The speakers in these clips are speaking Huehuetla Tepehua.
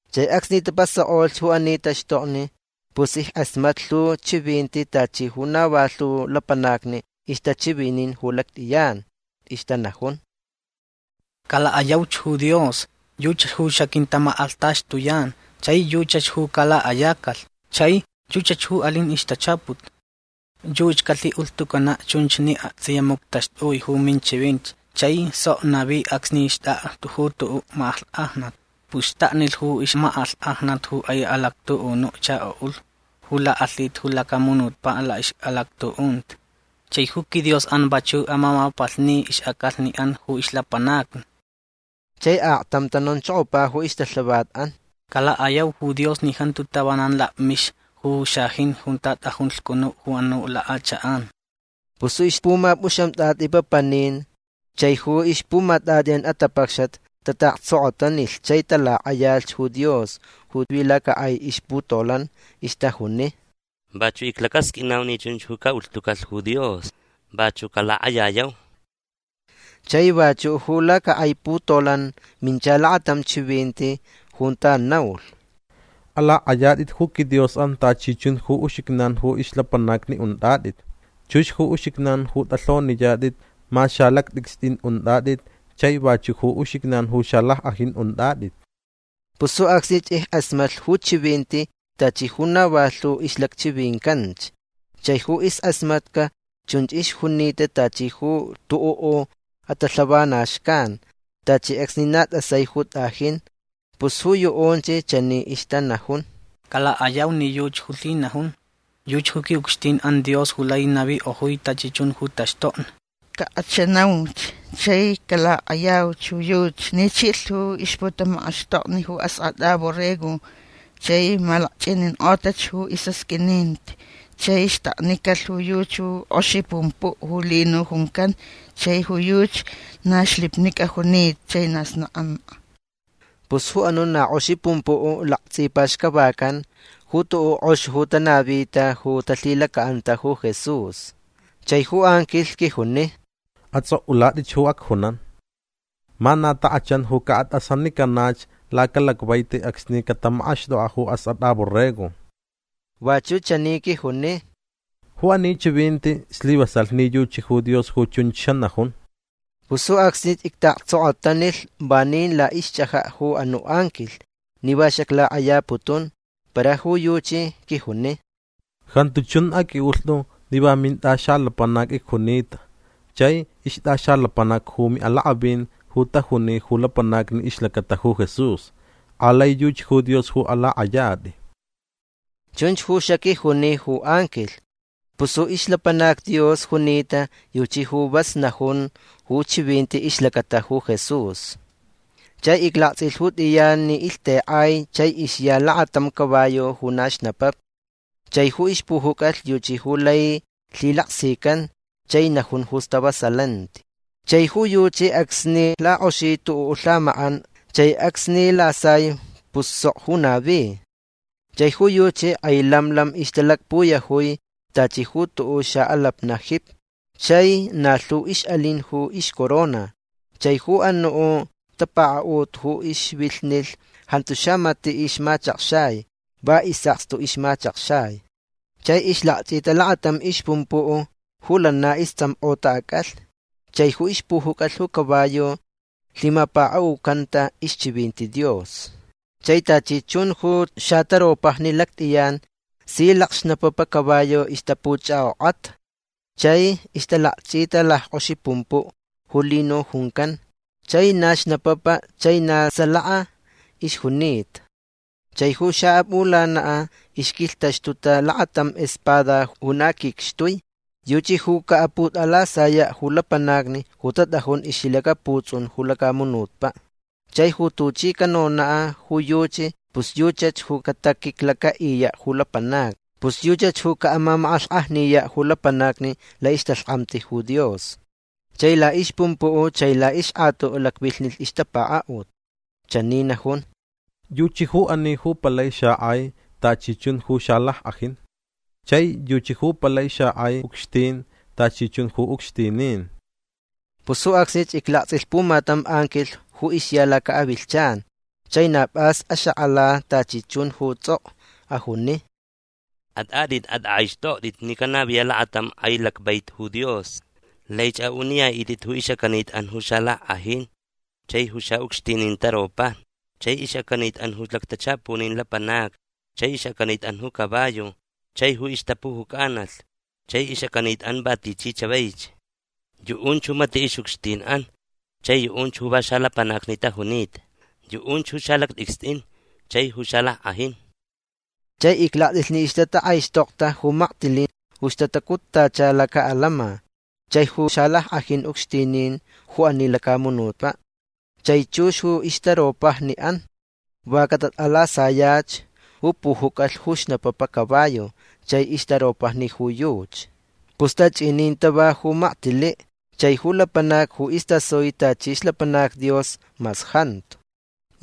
Chai acsni tapasak'olh ju ani taxtokni pus ick'asmatlh lhu chivinti tachi ju na va lhu lapanacni ixtachivinin ju lact'iyan. Ixtanajun: Calak'ayauch ju Dios. Yuchach ju xaquintamak'alhtaxtuyan. Chai yuchach ju calak'ayacalh. Chai yuchach ju alin ixtachaput. Yuchi calhi'ulhtucana' chunch ni akts'iya muctaxtui ju ixchivinti chai sok navi acsni xt'ak'a ju tu'u' mak'alhk'ajnat. Pus xtaknilh ju ixmak'alhk'ajnat ju k'ai alactu'unu chako'ulh ju lak'alhita ju lacamunutpa' la'ix'alactu'unti. Chai ju quiDios'an vachu' amamapalhni ix'ac'alhni'an ju ixlapanacni. Chai aktam tanonchokopa ju ixtalhavat'an: ―Calak'ayau ju Dios ni jantu tavanan lakmixa ju xajin junta t'ajun lhcunu' ju anu' lak'achak'an. Pus ju ixpumap'uxamt'at'i'an papanin chai ju ixpumat'at'i'an atapacxat tata'aktsokotanilh chai talak'ayalh ju Dios ju vi lacak'ai ixputolan. Ixtajuni: ―Vachu' iclacasq'uinau ni chunch ju ca'ulhtucalh ju Dios. Vachu' calak'ayayau. Chai vachu' ju lacak'ai putolan mincha lakatam chivinti junta naulh: Alak'ayat'it ju quiDios'an tachi chun ju uxijnan ju ixlapanacni unt'at'it. Chux ju uxijnan ju t'alhoniyat'it mas xalact'icst'in unt'at'it chai vachu' ju uxijnan ju xalack'ajin unt'at'it. Pus ju acsnich ick'asmatlh ju chivinti tachi ju na va lhu ixlacchivincanch. Chai ju isk'asmatca chunch ixjunita tachi ju tu'u' atalhavana xcan. Tachi acsni na t'asai ju t'ajin. Pus ju yu'unch chani ixtanajun: Calak'ayau ni yuchi ju lhinajun. Yuchi ju qui'ucxtin'an Dios ju lai navik'ojui tachi chun ju taxtokni. Cak'achanauch chai calak'ayauch ju yuchi ni chilh ju ixputamak'axtokni ju Ask'at'a Borrego chai malakch'inink'otach ju is'asq'uininti. Chai xtaknicalh ju yuchi ju k'oxi pumpu' ju lino juncan. Chai ju yuchi na xlipnic'a junita chai na snak'ank'a. Pus ju anu' na k'oxi pumpu' laktsipaxcavacan ju tu'u' k'ox ju tanavita ju talhilaca'anta ju Jesús. Chai ju anquilh quijuni: ―Ats'ok'ulat'ich ju acjunan: “Ma na tak'achan ju ca'at'asanicanach lacalacvaiti acsni catamak'axt'ok'a' ju Ask'at'a Borrego”. Vachu' chani quijuni: ―Ju ani chivinti slivasalh ni yuchi ju Dios ju chunch xanajun. Pus ju acsnich icta'aktsokotanilh vanin la'ixch'aja' ju anu' anquilh ni va xaclak'ayaputun. Para ju yuchi quijuni: ―Jantu chun aq'ui'ulht'u ni va mint'axalapanac icjunita chai ixt'axalapanac ju mi'alak'avin ju tajuni ju lapanacni ixlacata ju Jesús. Alai yuchi ju Dios ju alak'ayat'i. ―Chunch ju xaquijuni ju anquilh. Pus ju ixlapanac Dios junita yuchi ju vas najun ju chivinti ixlacata ju Jesús. Chai iclakts'ilh ju t'iyan ni ilhtek'ai chai ixya lakatam caballo ju na xnapapa. Chai ju ixpujuc'alh yuchi ju lai lhilaksican chai najun ju stavasalanti. Chai ju yuchi acsni lak'oxi tu'u' lhamak'an chai acsni lasai pus sok ju navi. Chai ju yuchi k'ai lam lam ixtalakpuyajui tachi ju tu'u' xa'alapna' jipi. Chai na lhu ix'alin ju ixcorona. Chai ju anu' tapaka'ut ju ixvilhnilh jantu xamati' ixmachakxai. Va is'akstu ixmachakxai. Chai ixlakch'ita lakatam ixpumpu' ju lana ists'amk'ota ac'alhni. Chai ju ixpujuc'alh ju caballo lhimapaka'ucanta ixchivinti Dios. Chai tachi chun ju xataropajni lact'iyan si lacxnapapa caballo ixtapuch'ak'ok'ata chai ixtalakch'ita lack'oxi pumpu' ju lino juncan. Chai na xnapapa chai na salaka ixjunita. Chai ju xa'ap'ulana' ixquilhtaxtuta lakatam espada ju na quicxtui. Yuchi ju ca'aput'alasaya' ju lapanacni ju tat'ajun ixlhilacaputs'un ju lacamunutpa'. Chai ju tuchi canona' ju yuchi pus yuchach ju cataquiclaca'iya' ju lapanacni. Pus yuchach ju ca'amamak'alhk'ajniya' ju lapanacni la'ixtalhk'amti ju Dios. Chai la'ixpumpu' chai la'ixk'atu' lacvilhnilh ixtapaka'ut. Chani najun: “Yuchi ju ani ju palai xak'ai tachi chun ju xalack'ajin. Chai yuchi ju palai xak'ai ucxtin tachi chun ju ucxtinin”. Pus ju acsnich iclakts'ilh pumatam anquilh ju ixya laca'avilhchan. Chai na p'as axak'ala tachi chun ju ts'ok'o. Ajuni: ―At'at'it. At'ak'aixt'okt'it ni canaviya' lakatam k'ai lacvaiti ju Dios. Laich a'uniya'it'it ju ix'acanit'an ju xalack'ajin chai ju xa'ucxtinin taropajni chai ix'acanit'an ju lactachapunin lapanacni chai ix'acanit'an ju caballo chai ju ixtapujuc'analh chai ix'acanit'an va tichi chavaich. Yu'unch ju mati' ix'ucxtin'an chai yu'unch ju va xalapanacni tajunita. Yu'unch ju salact'icst'in chai ju xalack'ajin. Chai iclakts'ilh ni ixtatak'aixtokta ju maktili' ju ixtacuttacha laca'alama chai ju xalack'ajin ucxtinin ju ani lacamunutpa' chai chux ju ixtaropajni'an. Va catat'alasaya' ju pujuc'alh ju xnapapa caballo chai ixtaropajni ju yuchi. Pus tach'inin tava ju maktili' chai ju lapanac ju istasui tachi ixlapanac Dios mas jantu.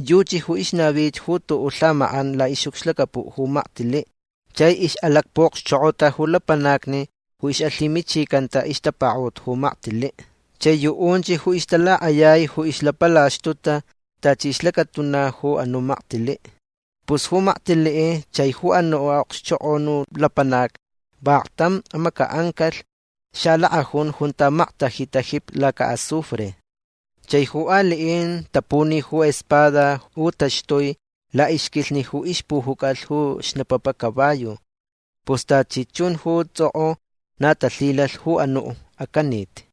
Yuchi ju ixnavich ju tu'u' lhamak'an la'ix'ucxlacapu' ju maktili' chai ix'alacpu'okxchok'ota ju lapanacni ju ix'alhimichicanta ixtapaka'ut ju maktili' chai yu'unch ju ixtalak'ayai ju ixlapalaxtuta tachi ixlacatuna ju anu' maktili'. Pus ju maktili' chai ju anu' a'okxchok'onu lapanac vaklhtam amaca'ancalh xalak'ajun junta maktajita jipi laca'azufre. Chai ju ali'in tapuni ju espada ju taxtui la'ixquilhni ju ixpujuc'alh ju xnapapa caballo. Pus tachi chun ju ts'ok'o na talhilalh ju anu' acanit.